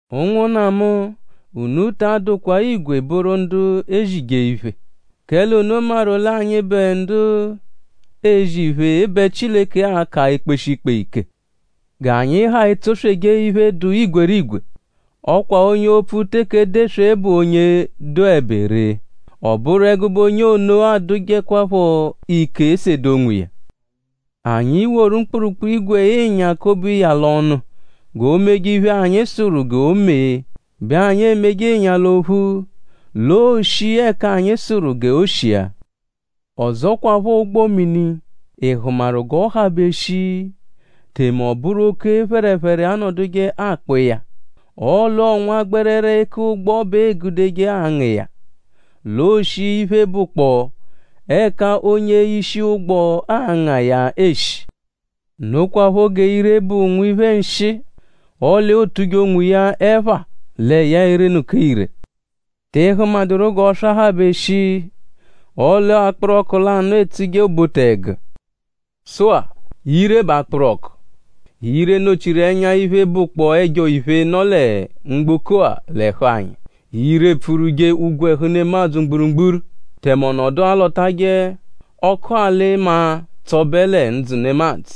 Ụnwunna mu; unu ta adụkwa igwe bụru ndu ezije iphe; kẹle unu maru l'anyịbe ndu ezije iphe bẹ Chileke a-ka ekpeshi ikpe ike. G'anyi ha etsosweje iphe, dụ igwerigwe. Ọ kwa onye opfu teke edeswe bụ onye dụebe ree. Ọ bụru ẹgube onye ono adụjekwapho ike sede onwiya. Anyi -woru mkpụrukpu-ígwè-ịnya kobe ịnya l'ọnu g'o meje iphe, anyi sụru g'o mee bẹ anyi emeje ịnya l'ophu; l'ooshi ẹka anyi sụru g'o shia. Ọzokwapho ụgbo-mini;?Ị hụmaru g'ọ habe shii; tẹme ọ bụru oke phẹrephere anọduje akpọ iya; ọle ọo nwa gbẹrere eku ụgbo bẹ eegudeje anga iya l'ooshi iphe, bụkpoo ẹka onye-ishi ụgbo anga iya eshi. Nokwaphọ g'ire bụ nwiphe nshịi; ọle ootuje onwiya ẹpha lẹ ya erenụka ire.?Tị hụmaduru g'ọswa habe shii? ọle akpụru ọku lanụ etsuje obote-ẹgu. Sụ-a; ire bụ akpụru ọku. Ire nọ-chiru ẹnya iphe, bụkpoo ẹjo-iphe, nọ lẹ mgboko-a l'ẹhu anyi. Ire epfurwuje ogwẹhu nemadzụ mgburugburu; tẹme ọ nọdu alọtaje ọku-alị-maa tsọbe lẹ ndzụ nemadzụ;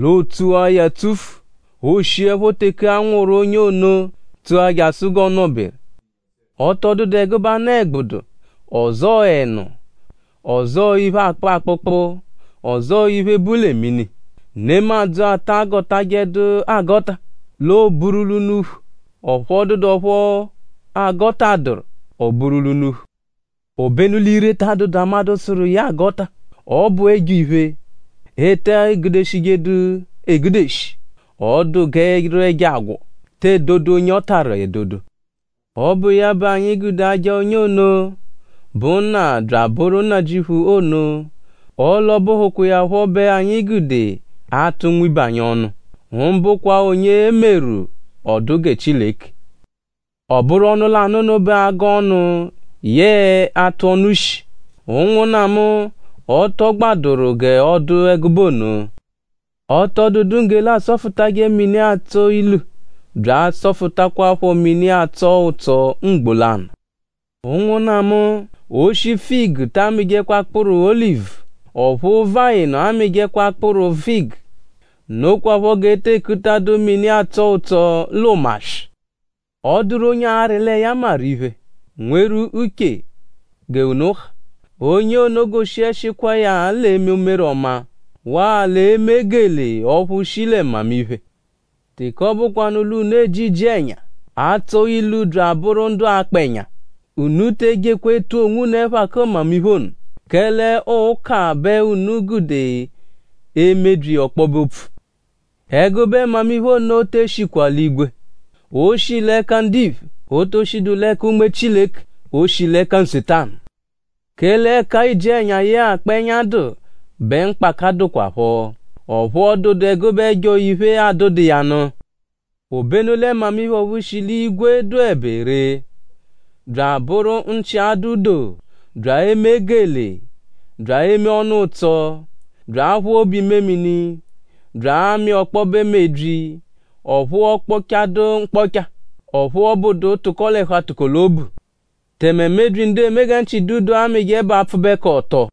l'ootsua ya tsufu; ooshiẹpho teke a nwụru onye ono; tsua jasụ g'ọo-nọ-beru. Ọ tọ dụdu ẹgube anụ-ẹgbudu; ọzoo ẹnu; ọzoo iphe, akpụ akpụkpu; ọzoo iphe, bu lẹ mini, nemadzụ ata agọtajedu agọta; l'ooburu l'unuphu; ọphu ọ dụdu ọphu a gọtaadaru; o buru l'unuphu. Obenu l'ire ta adụdu amadụ sụru iya agọta; ọ bụ ẹjo-iphe, e te gudeshijedu egudeshi. Ọ dụ g'ẹ́rú ẹjo agwọ, te edodu onye ọ tarụ edodo. Ọ bụ iya bẹ anyi gude aja onye ono, bụ Nna bya bụru Nnajịuphu ono; ọle ọ bụhukwa iya phọ bẹ anyi gude atụ nwibe anyi ọnu; mbụkwa onye e meru; ọ dụ gẹ Chileke. Ọ bụru ọnu lanụ ono bẹ agọ ọnu yẹe atụ ọnu shi. Ụnwunna mu; ọ tọ gbadụru g'ọ dụ ẹgube ono. Ọ tọ dụdu nggele, asọfutaje mini, atsọ ilu bya asọfutajekwapho mini, atsọ ụtso mgbo lanụ. Ụnwunna mu! Oshi figu ta amịjekwa akpụru olivu. Ọphu vayịnu amịjekwa akpụru figu. Nokwaphọ g'e te ekutadu mini, atsọ ụtso l'ụmaswi. ?Ọ dụru onye arị lẹ ya maru iphe; nweru uche g'unu ha? Onye ono goshiẹshikwa iya l'eme umere ọma; waa l'eme gelee ọphu shi lẹ mmamiphe. Teke ọ bụkwanu l'unu eji iji-ẹnya, atsọ-ilu bya abụru ndu akpa ẹnya; unu te ejekwa etu onwunu ẹpha kẹ mmamiphe ono; kẹle ọo ụka bẹ unu gude emebyi ọkpobe-opfu. Ẹgube mmamiphe ono te eshikwa l'igwe. O shi l'ẹka ndiphe. O to shidu l'ẹka Unme Chileke. O shi l'ẹka Nsetanu. Kẹle ẹka iji-ẹnya yẹe akpa ẹnya dụ bẹ mkpaka dụkwapho; ọphu ọ dụdu ẹgube ẹjo-iphe, adụdu iya nụ. Obenu lẹ mmamiphe ọphu shi l'igwe dụebe ree; bya abụru nchi-adụ-doo; bya eme gelee; bya eme ọnu-ụtso; bya aphụ obu-imemini; bya amị ọkpobe mebyi; ọphu ọokpochadu mkpọcha; ọphu ọ bụdu tụko l'ẹhu-atụko-l'obu. Tẹme mebyi, ndu eme gẹ nchi dụ doo amịje bụ apfụbekoto.